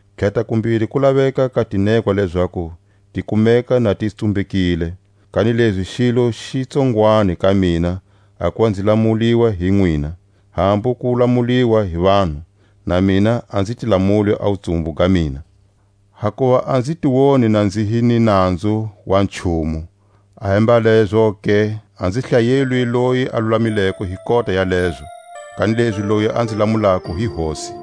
Tlhatakumbiri ku laveka ka tinekwa lezaku ti kumeka na ti tsumbekile. Kanilezi xilo xi tsongwani ka mina a kuva nzi lamuliwa hi nwina, hambu ku lamuliwa hi vanhu; na mina a nzi ti lamuli a wutsumbu ga mina. Hakuva a nzi ti woni na nzi hi ni nanzu wa nchumu; ahembalezoke a nzi hlayelwi loyi a lulamileko hi kota ya lezo: kanilezi loyi a nzi lamulako hi Hosi.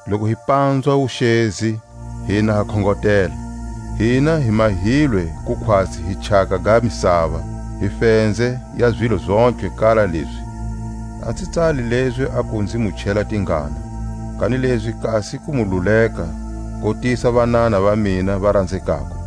loku hi panzwa wuxezi, hina ha khongotela. Hina hi mahilwe ku khwatsi hi chaka ga misava, hi fenze ya zilo zontlhe kala lezi. A nzi tsali lezi aku nzi mu chela tingana, kanilezi kasi ku mu luleka kotisa vanana va mina va ranzekako.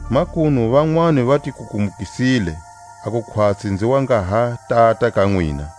Makunu vanwani va ti kukumukisile, a ku khwatsi nzi wa nga ha tata ka nwina.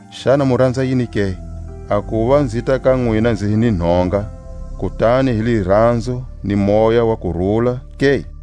Xana mu ranza yini ke? A kuva nzita ka nwina nzi hi ni nhonga, kutani hi liranzo ni moya wa kurula ke?